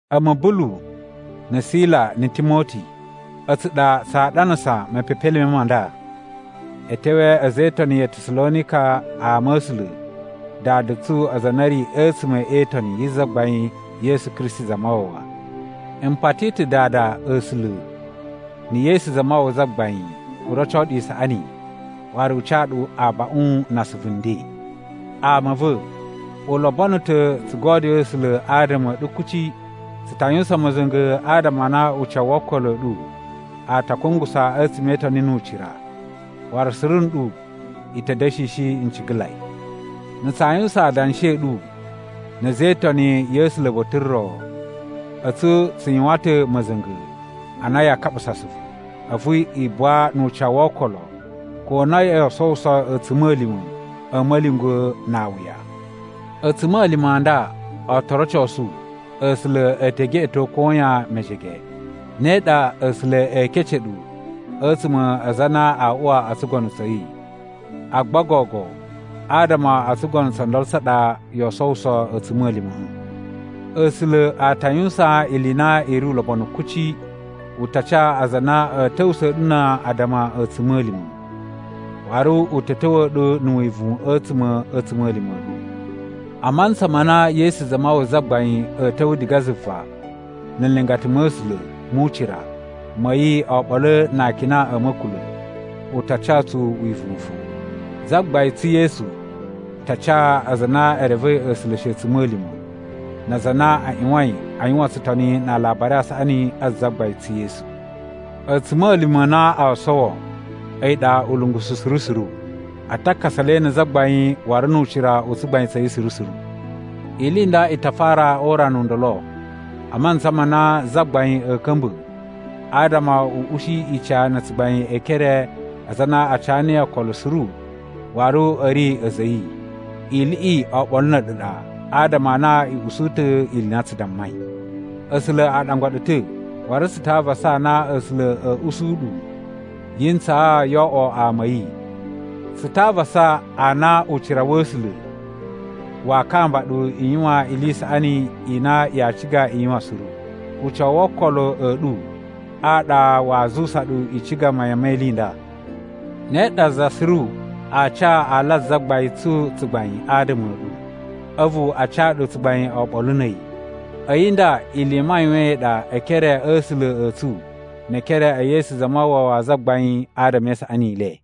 A̱mu Bulu, na̱ Sila na̱ Timoti, a̱tsu ɗa tsaa ɗanasa mepepelime ma nda e tewee a̱za̱ e Itoni ya Tasalonika ama a̱ A̱sula̱ Dada tsu aza a na a̱ ri a̱tsuma̱ e itoni yi Zagbain Yesu Kristi Zamawawa. M pati ta̱ Dada A̱sula̱ na̱ Yesu Zamawawa Zagbain u roco ɗu isaꞌani waru u ca ɗu abaꞌun na asuvu nden! Ama a̱ va̱, u lobono ta̱ tsu godyoo A̱sula̱ adama a̱ ɗu kuci, tsu ta yuwusan ma̱za̱nga̱ adama a na ucawu wo okolo a̱ ɗu a ta kungusa a̱tsuma̱ e itoni nu ucira, waru suru nɗu i ta̱ da̱shishi ncigalai. Na̱ tsaa yuwusan adanshi a̱ ɗu na̱ a̱za̱ e Itoni ya̱ A̱sula̱ ba̱ta̱ ro, a̱tsu tsu yuwan ta̱ ma̱za̱nga̱ a na yaa kaɓusa asuvu, a̱vu i buwa nu ucawu wo okolo ko na yoo sowuso a̱tsuma̱lima̱ a̱ ma̱lyungwa̱ na awuya. A̱tsuma̱lima̱ a nda o to rocosu A̱sula̱ e te geꞌeto koyan mejege. Ne ɗa A̱sula̱ ee kece ɗu a̱tsuma̱ a aza a na aa uwa o tsugono tsa̱ yi, agba gogo adama o tsugono tso ndolo tsa ɗa yoo sowuso a̱tsuma̱lima̱ꞌa̱. A̱sula̱ a ta yuwusan ili i na i ri ulobonu kuci. U ta ca aza a na a̱ ta̱wusa̱a̱ ɗu na addama a̱tsuma̱lima̱. Waru u ta̱ ta̱wa̱a̱ ɗu na̱ wivuwun a̱tsuma̱ a̱ a̱tsuma̱lima̱ a̱ ɗu. A mantsa ma na Yesu Zamawawa Zagbain a̱a̱ ta̱wa̱ diga zuva na̱ nlingata ma̱ A̱sula̱ mu ucira ma̱ yi oɓolo na akina a̱ ma̱kula̱ u ta ca tsu wivuwun fo. Zagbain tsu Yesu ta ca aza a na e revei A̱sula̱ shi a̱tsuma̱lima̱ na aza a na a ꞌyuwain a yuwan tsutoni na Alabari a Saꞌani a Zagbain tsu Yesu. A̱tsuma̱lima̱ a na oo sowo a̱yi ɗa ulungusu suru suru. A ta kasa le na̱ Zagbain waru nu ucira u tsugbain tsa̱ yi suru suru. Ili i nda i ta fara o urana u ndolo a mantsa ma na Zagbain a̱a̱ ka̱mba̱ adama u ushi ica na̱ tsugbain e ekere a aza a na a ca niyi okolo suru waru a̱ ri a̱za̱ a̱ yi. Iliꞌi oɓolo na̱ a̱ɗu ɗa, adama a na i usu ta̱ ili i na tsu dammai. A̱sula̱ a ɗangwa ɗu ta̱, waru tsu ta avasa a na A̱sula̱ a̱a̱ usu ɗu yi ntsaa yoo oꞌwo ama a̱ yi. Tsu ta avasa a na ucira wa̱ A̱sula̱ waa kamba ɗu i yuwan ili i saꞌani i na yaa ciga i yuwan suru. Ucawu wo okolo a̱ ɗu a ɗa waa zuwusa ɗu i ciga mayan me ili i nda. Ne ɗa za suru aa ca ala a Zagbain tsu tsugbain adama a̱ ɗu, a̱vu a ca ɗu tsugbain oɓolo na̱ a̱yi. A̱yi nda ili i mayuwaan i ɗa e ekere a̱ A̱sula̱ a̱ tsu ne ekere e Yesu Zamawawa Zagbain adama e isaꞌani i le.